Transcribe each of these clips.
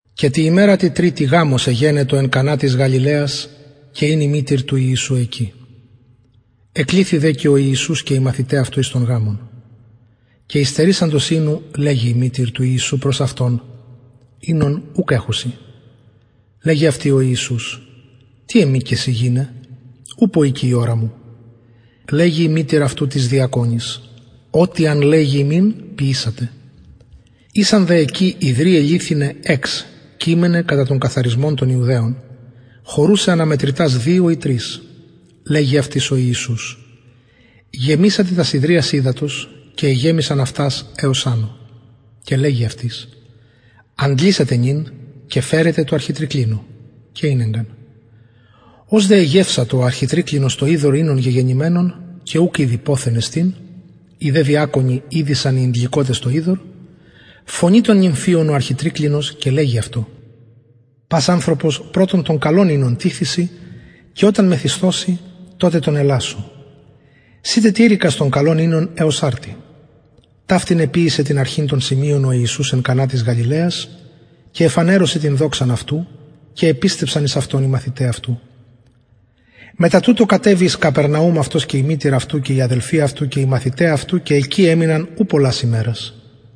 και τη ημερα τη τριτη γαμος εγενετο εν κανα της γαλιλαιας και ην η μητηρ του ιησου εκει εκληθη δε και ο ιησους και οι μαθηται αυτου εις τον γαμον και υστερησαντος οινου λεγει η μητηρ του ιησου προς αυτον οινον ουκ εχουσιν λεγει αυτη ο ιησους τι εμοι και σοι γυναι ουπω ηκει η ωρα μου λεγει η μητηρ αυτου τοις διακονοις ο τι αν λεγη υμιν ποιησατε ησαν δε εκει υδριαι λιθιναι εξ κειμεναι κατα τον καθαρισμον των ιουδαιων χωρουσαι ανα μετρητας δυο η τρεις λεγει αυτοις ο ιησους γεμισατε τας υδριας υδατος και εγεμισαν αυτας εως ανω και λεγει αυτοις αντλησατε νυν και φερετε τω αρχιτρικλινω και ηνεγκαν ως δε εγευσατο ο αρχιτρικλινος το υδωρ οινον γεγενημενον και ουκ ηδει ποθεν εστιν οι δε διακονοι ηδεισαν οι ηντληκοτες το υδωρ φωνει τον νυμφιον ο αρχιτρικλινος και λεγει αυτω πας ανθρωπος πρωτον τον καλον οινον τιθησιν και οταν μεθυσθωσιν τοτε τον ελασσω συ τετηρηκας τον καλον οινον εως αρτι ταυτην εποιησεν την αρχην των σημειων ο ιησους εν κανα της γαλιλαιας και εφανερωσεν την δοξαν αυτου και επιστευσαν εις αυτον οι μαθηται αυτου μετα τουτο κατεβη εις καπερναουμ αυτος και η μητηρ αυτου και οι αδελφοι αυτου και οι μαθηται αυτου και εκει εμειναν ου πολλας ημερας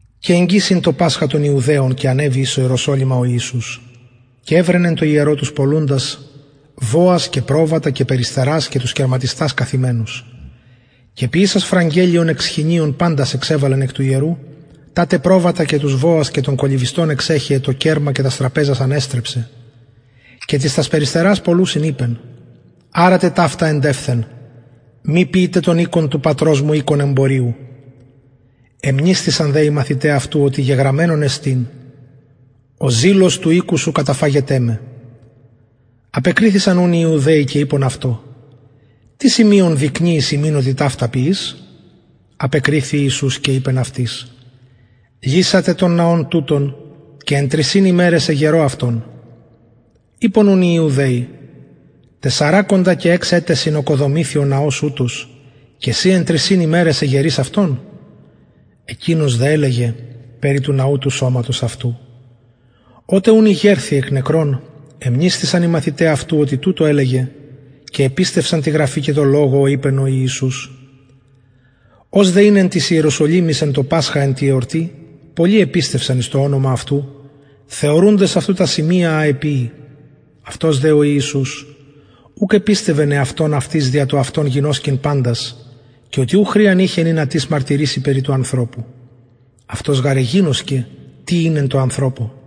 και εγγυς ην το πασχα των ιουδαιων και ανεβη εις ιεροσολυμα ο ιησους και ευρεν εν τω ιερω τους πωλουντας βοας και προβατα και περιστερας και τους κερματιστας καθημενους και ποιησας φραγελλιον εκ σχοινιων παντας εξεβαλεν εκ του ιερου τα τε προβατα και τους βοας και των κολλυβιστων εξεχεεν το κερμα και τας τραπεζας ανεστρεψεν και τοις τας περιστερας πωλουσιν ειπεν αρατε ταυτα εντευθεν μη ποιειτε τον οικον του πατρος μου οικον εμποριου εμνησθησαν δε οι μαθηται αυτου οτι γεγραμμενον εστιν ο ζηλος του οικου σου καταφαγεται με απεκριθησαν ουν οι ιουδαιοι και ειπον αυτω τι σημειον δεικνυεις ημιν οτι ταυτα ποιεις απεκριθη ιησους και ειπεν αυτοις λυσατε τον ναον τουτον και εν τρισιν ημεραις εγερω αυτον ειπον ουν οι ιουδαιοι τεσσαρακοντα και εξ ετεσιν ωκοδομηθη ο ναος ουτος και συ εν τρισιν ημεραις εγερεις αυτον εκεινος δε ελεγεν περι του ναου του σωματος αυτου οτε ουν ηγερθη εκ νεκρων εμνησθησαν οι μαθηται αυτου οτι τουτο ελεγεν και επιστευσαν τη γραφη και τω λογω ω ειπεν ο ιησους ως δε ην εν τοις ιεροσολυμοις εν τω πασχα εν τη εορτη πολλοι επιστευσαν εις το ονομα αυτου θεωρουντες αυτου τα σημεια α εποιει αυτος δε ο ιησους ουκ επιστευεν εαυτον αυτοις δια το αυτον γινωσκειν παντας και οτι ου χρειαν ειχεν ινα τις μαρτυρηση περι του ανθρωπου αυτος γαρ εγινωσκεν τι ην εν τω ανθρωπω